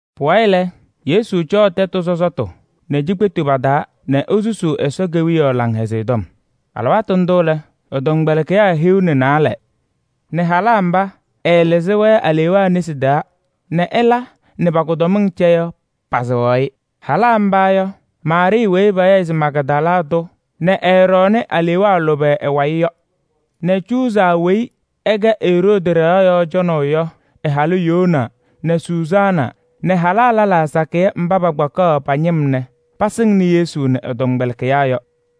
Pʋwayɩ lɛ, Yesu cɔɔ tɛtʋ sɔsɔtʋ nɛ cikpetu pa-taa nɛ esusuu Ɛsɔ Kewiyaɣ Laŋhɛzɩyɛ Tɔm. Alɩwaatʋ ndʋ lɛ, ɛ-tɔmkpɛlɩkɩyaa hiu nɛ naalɛ nɛ halaa mba ɛɛlɩzɩ-wɛ alewaa nesi taa nɛ ɛla nɛ pa-kʋdɔmɩŋ cɛ yɔ pasɩɣaɣ-ɩ. Halaa mba yɔ: Maarɩɩ weyi payaɣ se Magdala tʋ nɛ ɛɛɖɔɔnɩ alewaa lʋbɛ ɛ-wayɩ yɔ nɛ Cuuza weyi ɛkɛ Eroodi ɖɩɣa yɔɔ cɔnɩyʋ yɔ ɛ-halʋ Yoana nɛ Sʋzaana nɛ halaa lɛlaa sakɩyɛ mba pakpakaɣ pa-ñɩm nɛ pasɩŋnɩ Yesu nɛ ɛ-tɔmkpɛlɩkɩyaa yɔ.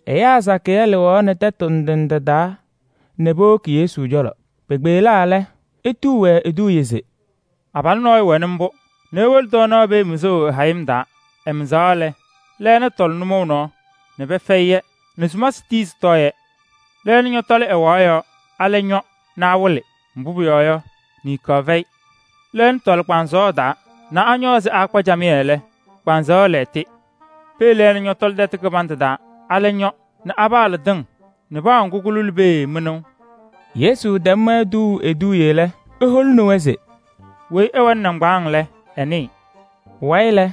Ɛyaa sakɩyɛ lɩɣaɣnɩ tɛtʋ ndɩ ndɩ taa nɛ powoki Yesu cɔlɔ. Pekpeɣlaa lɛ, etuu-wɛ eduuye se: “Abalʋ nɔɔyʋ wɛnɩ mbʋ nɛ ewolo tɔɔnaɣ pee mɩzʋʋ ɛ-hayɩm taa. Ɛmɩzaɣ lɛ, lɛɛna tɔlɩ nʋmɔʋ nɔɔ nɛ pɛfɛyɩ-yɛ nɛ sumasɩ tii sɩtɔɔ-yɛ. Lɛɛna ñɔtɔlɩ ɛwaɣ yɔɔ nɛ alɛ ñɔ nɛ awɩlɩ, mbʋ pʋyɔɔ yɔ, niŋkaɣ fɛyɩ. Lɛɛna tɔlɩ kpaŋsɔɔ taa nɛ añɔ ɛzɩ pɩɩkpa camɩyɛ lɛ, kpaŋsɔɔ lɛɣtɩ. Pee lɛɛna ñɔtɔlɩ tɛtʋ kɩbandʋ taa, alɛ ñɔ nɛ pɩpaɣlɩ tɩŋ nɛ paa ŋgʋ kʋlʋlɩ pee mɩnʋʋ.” Yesu tɛm-wɛ tuuu eduuye lɛ, eholini-wɛ se: “Weyi ɛwɛnɩ nɩŋgbaaŋ lɛ, ɛnɩɩ.” Pʋwayɩ lɛ,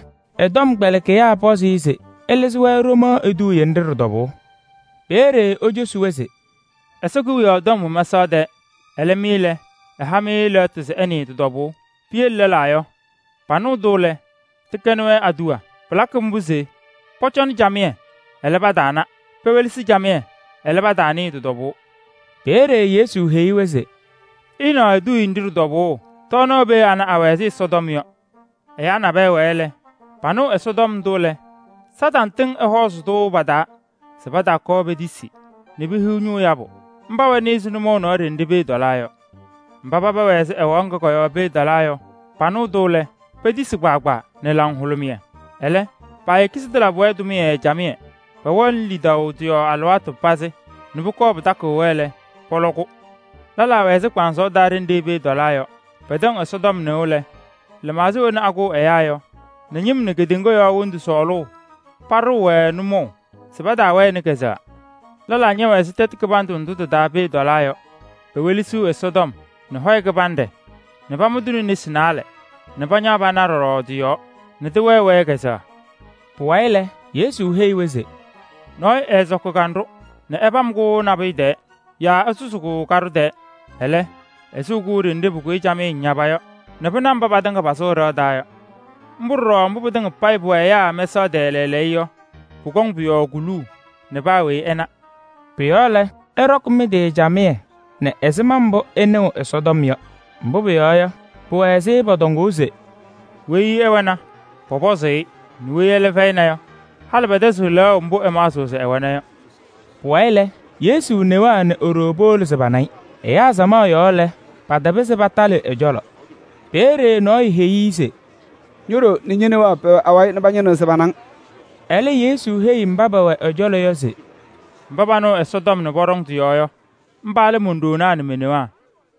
ɛ-tɔmkpɛlɩkɩyaa pɔzɩ-ɩ se ɛlɩzɩ-wɛ ɖomaɣ eduuye nɖɩ ɖɩ-tɔbʋʋ. Peeye ecosi-wɛ se: “Ɛsɔ Kewiyaɣ tɔm wɛ mɛsaɣ tɛɛ. Ɛlɛ mɩ lɛ, ɛha-mɩ lɛɣtʋ se ɩnɩɩ tɩ-tɔbʋʋ. Piyele lɛlaa yɔ, panɩɣ-tʋ lɛ, tɩkɛnɩ-wɛ aduwa. Pɩlakɩ mbʋ se: ‘Pɔcɔnɩ camɩyɛ, ɛlɛ, pataana nɛ pewelesi camɩyɛ, ɛlɛ, pataanɩɩ pʋ-tɔbʋʋ.’” Peeye Yesu heyi-wɛ se: “Ɩɩnaɣ eduuye nɖɩ ɖɩ-tɔbʋʋ: tɔɔnaɣ pee ana, awɛ ɛzɩ Ɛsɔtɔm yɔ. Ɛyaa nabɛyɛ wɛɛ, panɩɣ Ɛsɔtɔm ndʋ lɛ, Kañadʋ Satanɩ tɩŋ ɛhɔɔzɩ-tʋ pa-taa se pataakɔɔ petisi nɛ pehiɣ ñʋʋ yabʋ. Mba wɛnɩ ɛzɩ nʋmɔʋ nɔɔ ɖenɖe pee tɔlaa yɔ. Mba paba wɛ ɛzɩ ɛwaɣ ŋga kɔ-yɔɔ pee tɔlaa yɔ, panɩɣ-tʋ lɛ, petisi kpaagbaa nɛ laŋhʋlʋmɩyɛ. Ɛlɛ, paayeki se tɩlabɩ-wɛ tʋmɩyɛ camɩyɛ. Pɛwɛɣnɩ lidaʋ tɩ-yɔɔ alɩwaatʋ pazɩ nɛ pʋkɔɔ pɩtakɩɣ-wɛ lɛ, pɔlɔ-kʋ. Lɛlaa wɛ ɛzɩ kpaŋsɔɔ taa ɖenɖe pee tɔlaa yɔ. Pɛtɛŋ Ɛsɔtɔm nɩʋ lɛ, lɩmaɣza wena akʋʋ ɛyaa yɔ nɛ ñɩm nɛ kedeŋa yɔɔ wondu sɔɔlʋʋ paɖɩɣ-wɛ nʋmɔʋ nɛ paawɛɣnɩ kazʋwa. Lɛlaa ñɛwɛ ɛzɩ tɛtʋ kɩbandʋ ndʋ tɩ-taa pee tɔlaa yɔ. Pewelesiɣ Ɛsɔtɔm nɛ hɔyɛ kɩbanɖɛ nɛ pamʋ-tʋ nesi naalɛ nɛ pañaɣ pana pɔɖɔ tɩ-yɔɔ nɛ tɩwɛɛ-wɛ kazʋwa.” Pʋwayɩ lɛ, Yesu heyi-wɛ se: “Nɔɔyʋ ɛɛsɔkɩ kanɖʋ nɛ ɛpam-kʋ nabʋyʋ tɛɛ yaa ɛsʋzɩ-kʋ kaɖʋ tɛɛ. Ɛlɛ, ɛsɩɣ-kʋ ɖenɖe pʋkʋyɩ camɩyɛ ñaba yɔ nɛ pɩna mba patɩŋa pasʋʋ ɖɩɣa taa yɔ. Mbʋ ɖɔɖɔ mbʋ pɩtɩŋa payɩ pʋwɛ ɛyaa mɛsaɣ tɛɛ lɛɛlɛɛyɔ yɔ, pʋkɔŋ pʋ-yɔɔ kuluu nɛ paa weyi ɛna.” Pʋ-yɔɔ lɛ, ɩɖɔkɩ mɩ-tɩ camɩyɛ nɛ ɛzɩma mbʋ ɩnɩɣ Ɛsɔtɔm yɔ. Mbʋ pʋyɔɔ yɔ, pʋwɛ ɛzɩ pɔtɔŋʋʋ se: “Weyi ɛwɛna, pɔsɔzɩ-ɩ nɛ weyi ɛlɛ fɛyɩna yɔ, halɩ pɛtɛzɩɣ lɛɣʋ mbʋ ɛmaɣzɩɣ se ɛwɛna yɔ.” Pʋwayɩ lɛ, Yesu newaa nɛ e-ɖoo powolo se pana-ɩ. Ɛyaa samaɣ yɔɔ lɛ, patapɩzɩ patalɩ ɛ-cɔlɔ. Peeye nɔɔyʋ heyi-i se: “Ño-ɖoo nɛ ñe-newaa pɛwɛ awayɩ nɛ pañɩnɩɣ se pana-ŋ.” Ɛlɛ Yesu heyi mba pɛwɛ ɛ-cɔlɔ yɔ se: “Mba panɩɣ Ɛsɔtɔm nɛ pɔɖɔŋ tɩ-yɔɔ yɔ, mba lɛ mon-ɖoonaa nɛ me-newaa.”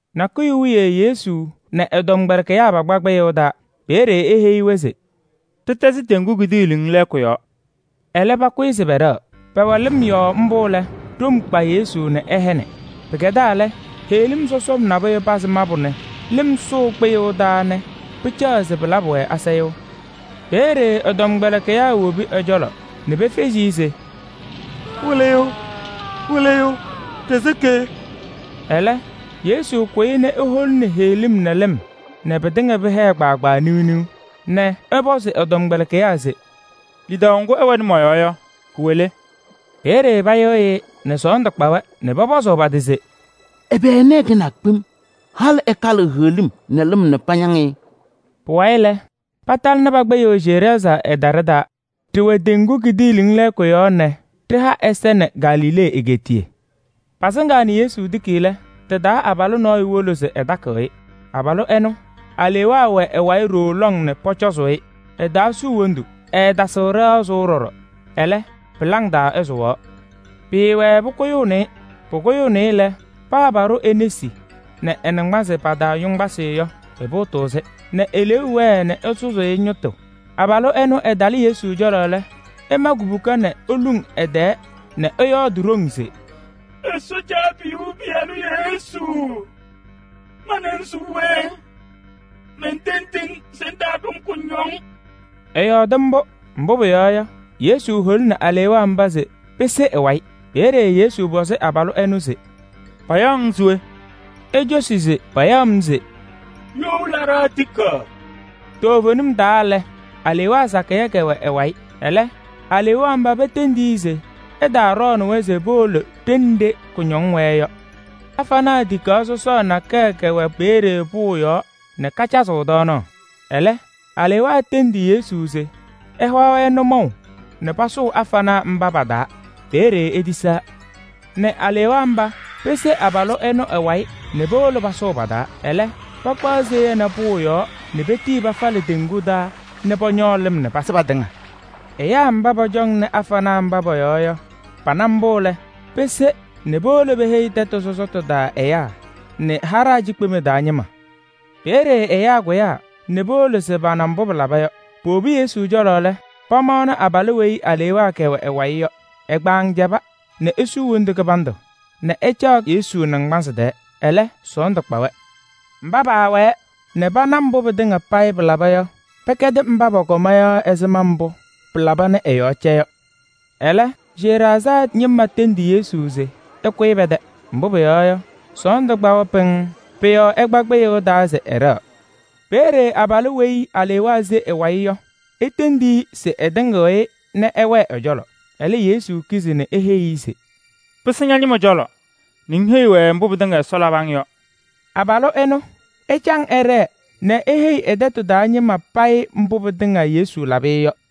Nakʋyʋ wiye Yesu nɛ ɛ-tɔmkpɛlɩkɩyaa pakpa kpɩyʋʋ taa. Peeye eheyi-wɛ se: “Ɖɩtɛzɩ teŋgu kidiiliŋ lɛɛkʋ yɔɔ.” Ɛlɛ pakʋyɩ se pɛɖɛɣ. Pɛwɛ lɩm yɔɔ mbʋ lɛ, ɖom kpa Yesu nɛ ɛhɛnɩ. Pɩkɛdaa lɛ, heɣlim sɔsɔm nabʋyʋ pazɩ mabʋ nɛ lɩm sʋʋ kpɩyʋʋ taa nɛ pɩcaɣ se pɩlabɩ-wɛ asayʋʋ. Peeye ɛ-tɔmkpɛlɩkɩyaa wobi ɛ-cɔlɔ nɛ pefezi-i se: “Wɩlɩyʋ, Wɩlɩyʋ, ɖɩsɩkɩ!” Ɛlɛ Yesu kʋyɩ nɛ ɛkalɩ heɣlim nɛ lɩm hola nɛ pɩtɩŋa pɩhɛɛ kpaagbaa niɣ niɣ nɛ ɛpɔzɩ ɛ-tɔmkpɛlɩkɩyaa se: “Lidaʋ ŋgʋ ɩwɛnɩ mɔ-yɔɔ yɔ, kʋwɛ le?” Peeye payɩɣyɩ-ɩ nɛ sɔɔndʋ kpa-wɛ nɛ pɔpɔzʋʋ pa-tɩ se: “Ɛbɛ ɛnɛ ɛkɛnaa kpem? Halɩ ɛkalɩɣ heɣlim nɛ lɩm nɛ pañaŋ-ɩ!” Pʋwayɩ lɛ, patalɩnɩ pa-kpɩyʋʋ Geraazaa ɛjaɖɛ taa. Ɖɩwɛ teŋgu kidiiliŋ lɛɛkʋ yɔɔ nɛ ɖɩha ɛza nɛ Galilee egeetiye. Pasɩŋaa nɛ Yesu tiki lɛ, tɩ-taa abalʋ nɔɔyʋ wolo se ɛkatɩɣ-ɩ. Abalʋ ɛnʋ, alewaa wɛ ɛ-wayɩ ɖooo lɔŋ nɛ pɔcɔzʋʋ-ɩ. Ɛtaasuu wondu, ɛɛtasɩɣ ɖɩɣa sʋʋ ɖɔɖɔ. Ɛlɛ, pɩlaŋ taa ɛsʋwaɣ. Pɩɩwɛɛ pʋkʋyʋʋnɩ-ɩ. Pʋkʋyɩnɩ-ɩ nɛ paa pɔhɔkɩ e-nesi nɛ ɛ-naŋgbanzɩ pa-taa yoŋgbasɩ yɔ, ɛpʋʋtʋʋ-sɩ, nɛ eleeu wɛɛ nɛ ɛsʋzʋʋ-ɩ ñɩtʋ. Abalʋ ɛnʋ ɛtalɩ Yesu cɔlɔ lɛ, ɛma kubuka nɛ eluŋ ɛ-tɛɛ nɛ ɛyɔɔdɩ ɖoŋ se: “Ɛsɔ Caabiyuu Pɩyalʋ Yesu, ma nɛ ŋ se we? Mentendiɣ-ŋ se ŋtaaɖʋ-m kʋñɔŋ.” Ɛyɔɔdɩ mbʋ, mbʋ pʋyɔɔ yɔ, Yesu holini alewaa mba se pese ɛ-wayɩ. Peeye Yesu pɔzɩ abalʋ ɛnʋ se: “Payaɣ-ŋ se we?” Ecosi se payaɣ-m se: “You Laɖaa Tikaɣ.” Toovenim taa lɛ, alewaa sakɩyɛ kɛwɛnɩ ɛ-wayɩ. Ɛlɛ alewaa mba petendi-i se ɛtaaɖɔɔnɩ-wɛ se powolo ɖenɖe kʋñɔŋ wɛɛ yɔ. Afanaa tikaɣ sɔsɔɔ nakɛyɛ kɛwɛ peeye pʋʋ yɔɔ nɛ kacazɩɣ tɔɔnaɣ. Ɛlɛ alewaa tendi Yesu se ɛha-wɛ nʋmɔʋ nɛ pasʋʋ afanaa mba pa-taa. Peeye etisaa nɛ alewaa mba pese abalʋ ɛnʋ ɛ-wayɩ nɛ powolo pasʋʋ pa-taa. Ɛlɛ pakpaɣ seya nɛ pʋʋ yɔɔ nɛ petii pafalɩ teŋgu taa nɛ pɔñɔɔ lɩm nɛ pasɩ patɩŋa. Ɛyaa mba pɔcɔŋaɣnɩ afanaa mba pɔ-yɔɔ yɔ, pana mbʋ pɩlaba yɔ lɛ, pese nɛ powolo peheyi tɛtʋ taa ɛyaa nɛ tɛyɛ ñɩma. Peeye ɛyaa kʋyaa nɛ powolo se pana mbʋ pɩlaba yɔ. Powobi Yesu cɔlɔ lɛ, pamaɣnɩ abalʋ weyi alewaa kɛwɛ ɛ-wayɩ yɔ. Ɛ-kpaŋ cɛba nɛ esuu wondu kɩbandʋ nɛ ɛcaɣ ɛ-naŋgbansɩ tɛɛ. Ɛlɛ sɔɔndʋ kpa-wɛ. Mba paawɛɛ nɛ pana mbʋ pɩtɩŋa payɩ pɩlaba yɔ, pɛkɛdɩ mba pɔkɔma yɔ ɛzɩma mbʋ pɩlaba nɛ ɛ-yɔɔ cɛ yɔ. Ɛlɛ, Geraazaa ñɩma tɩŋa tendi Yesu se ɛkʋyɩ pɛ-tɛ. Mbʋ pʋyɔɔ yɔ, sɔɔndʋ kpa-wɛ pɩŋŋ. Pʋ-yɔɔ ɛkpa kpɩyʋʋ taa se ɛɖɛɣ. Peeye abalʋ weyi alewaa se ɛ-wayɩ yɔ etendi-i se ɛtɩŋɩɣ-ɩ nɛ ɛwɛɛ ɛ-cɔlɔ. Ɛlɛ, Yesu kizi nɛ eheyi-i se: “Pɩsɩ ña-ñɩma cɔlɔ nɛ ŋheyi-wɛ mbʋ pɩtɩŋa Ɛsɔ labɩ-ŋ yɔ.” Abalʋ ɛnʋ, ɛcaŋ ɛɖɛɛ nɛ eheyi ɛ-tɛtʋ taa ñɩma tɩŋa payɩ mbʋ pɩtɩŋa Yesu labɩ-ɩ yɔ.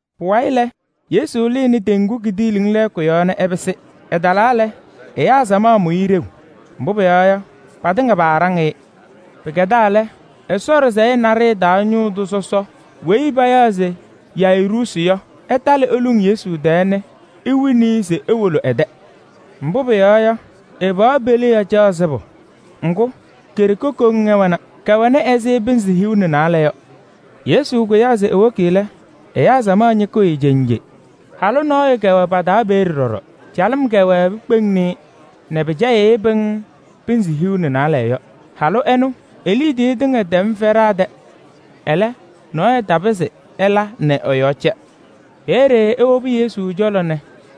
Pʋwayɩ lɛ, Yesu lɩnɩ teŋgu kidiiliŋ lɛɛkʋ yɔɔ nɛ ɛpɩsɩ. Ɛtalaa lɛ, ɛyaa samaɣ mʋ-ɩ ɖeu, mbʋ pʋyɔɔ yɔ, patɩŋa paaɖaŋ-ɩ. Pɩkɛdaa lɛ, Ɛsɔ ɖɩsɛyɛ naɖɩyɛ taa ñʋʋ tʋ sɔsɔ weyi payaɣ se Yayiruusi yɔ, ɛtalɩ eluŋ Yesu tɛɛ nɛ ewini-i se ewolo ɛ-tɛ. Mbʋ pʋyɔɔ yɔ, ɛ-pɩɣa peliɣa caɣ sɩbʋ. Ŋgʋ, ke-ɖeke koŋ ɛwɛna. Kɛwɛnɩ ɛzɩ pɩnzɩ hiu nɛ naalɛ yɔ. Yesu kʋyaa se ewoki lɛ, ɛyaa samaɣ ñɩkɩɣ-ɩ cenje. Halʋ nɔɔyʋ kɛwɛ pa-taa peeye ɖɔɖɔ. Calɩm kɛwɛɛ pikpeŋni-i nɛ pɩcɛyɩɣ-ɩ pɩŋŋ pɩnzɩ hiu nɛ naalɛ yɔ. Halʋ ɛnʋ, e-liidiye tɩŋa tɛmnɩ fɛɖaa tɛ. Ɛlɛ, nɔɔyʋ tapɩzɩ ɛla nɛ ɛ-yɔɔ cɛ. Peeye ewobi Yesu cɔlɔ nɛ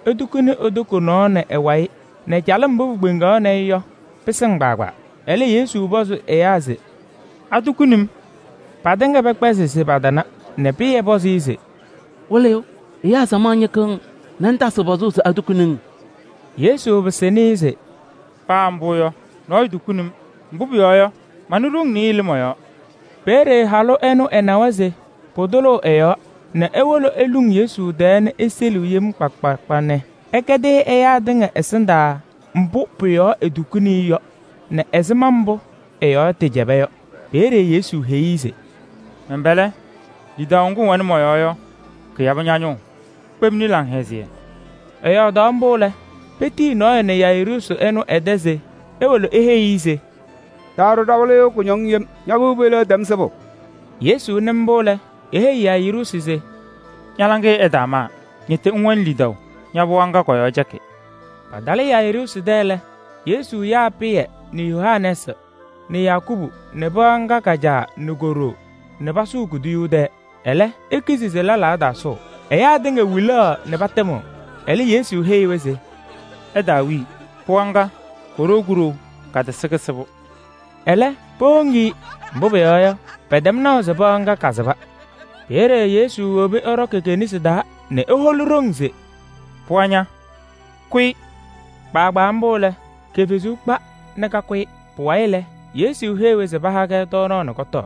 etukuni e-toko nɔɔ nɛ ɛ-wayɩ nɛ calɩm mbʋ pikpeŋaɣnɩ-ɩ yɔ pɩsɩŋ kpaagbaa. Ɛlɛ Yesu pɔzɩ ɛyaa se: “Atukuni-m?” Patɩŋa pɛkpɛzɩ se patana nɛ Pɩyɛ pɔzɩ-ɩ se: “Wɩlɩyʋ! Ɛyaa samaɣ ñɩkɩɣ-ŋ nɛ ŋtasɩɣ pɔzʋʋ se atukuni-ŋ?” Yesu pɩsɩnɩ-ɩ se: “Paa mbʋ yɔ, nɔɔyʋ tukuni-m. Mbʋ pʋyɔɔ yɔ, manɩ ɖoŋ nɩɩyɩ lɩ mɔ-yɔɔ.” Peeye halʋ ɛnʋ ɛnawa se pʋtʋlʋʋ ɛ-yɔɔ, nɛ ewolo eluŋ Yesu tɛɛ nɛ eseliɣ yem kpa kpa kpa nɛ ɛkɛdɩ-ɩ ɛyaa tɩŋa ɛsɩndaa mbʋ pʋ-yɔɔ etukuni-i yɔ nɛ ɛzɩma mbʋ ɛ-yɔɔ tɩcɛba yɔ. Peeye Yesu heyi-i se: “Mɛn-pɛlɛ! Lidaʋ ŋgʋ ŋwɛnɩ mɔ-yɔɔ yɔ, kɩyabɩ ña-ñʋʋ. Kpemni laŋhɛzɩyɛ.” Ɛyɔɔdaɣ mbʋ lɛ, petiyi nɔɔyʋ nɛ Yayiruusi ɛnʋ ɛ-tɛ se ewolo eheyi-i se: “Taaɖʋ ɖa-wɩlɩyʋ kʋñɔŋ yem, ña-pɩɣa peliɣa tɛm sɩbʋ.” Yesu nɩ mbʋ lɛ, eheyi Yayiruusi se: “Ña-laŋɩyɛ ɛtaamaa, ñɩtɩ ŋwɛnɩ lidaʋ, ña-pɩɣa ŋga kɔ-yɔɔ cɛkɩ.” Patalɩ Yayiruusi tɛ lɛ, Yesu yaa Pɩyɛ nɛ Yohanɛɛsɩ nɛ Yakubu nɛ pɩɣa ŋga ka-caa nɛ ko-ɖoo nɛ pasʋʋ kuduyuu tɛɛ. Ɛlɛ, ekizi se lɛlaa ɛtaasʋʋ. Ɛyaa tɩŋa wilaɣ nɛ patɩmɩɣ. Ɛlɛ Yesu heyi-wɛ se: “Ɩtaawii! Pɩɣa ŋga, koɖou kuɖou, katɩsɩ kɩsɩbʋ.” Ɛlɛ, powoŋ-i, mbʋ pʋyɔɔ yɔ, pɛtɛm naʋ se pɩɣa ŋga kasɩba. Peeye Yesu wobi ɛɖɔkɩ ke-nesi taa nɛ eholi ɖoŋ se: “Pɩɣa ña, kʋyɩ!” Kpaagbaa mbʋ lɛ, ke-fezuu kpa nɛ kakʋyɩ. Pʋwayɩ lɛ, Yesu heyi-wɛ se paha-kɛ tɔɔnaɣ nɛ kɔtɔɔ.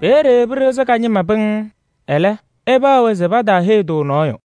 Peeye pɩɖɩɣzɩ ka-ñɩma pɩŋŋ. Ɛlɛ, ɛpaɣ-wɛ se pataaheyi-tʋ nɔɔyʋ.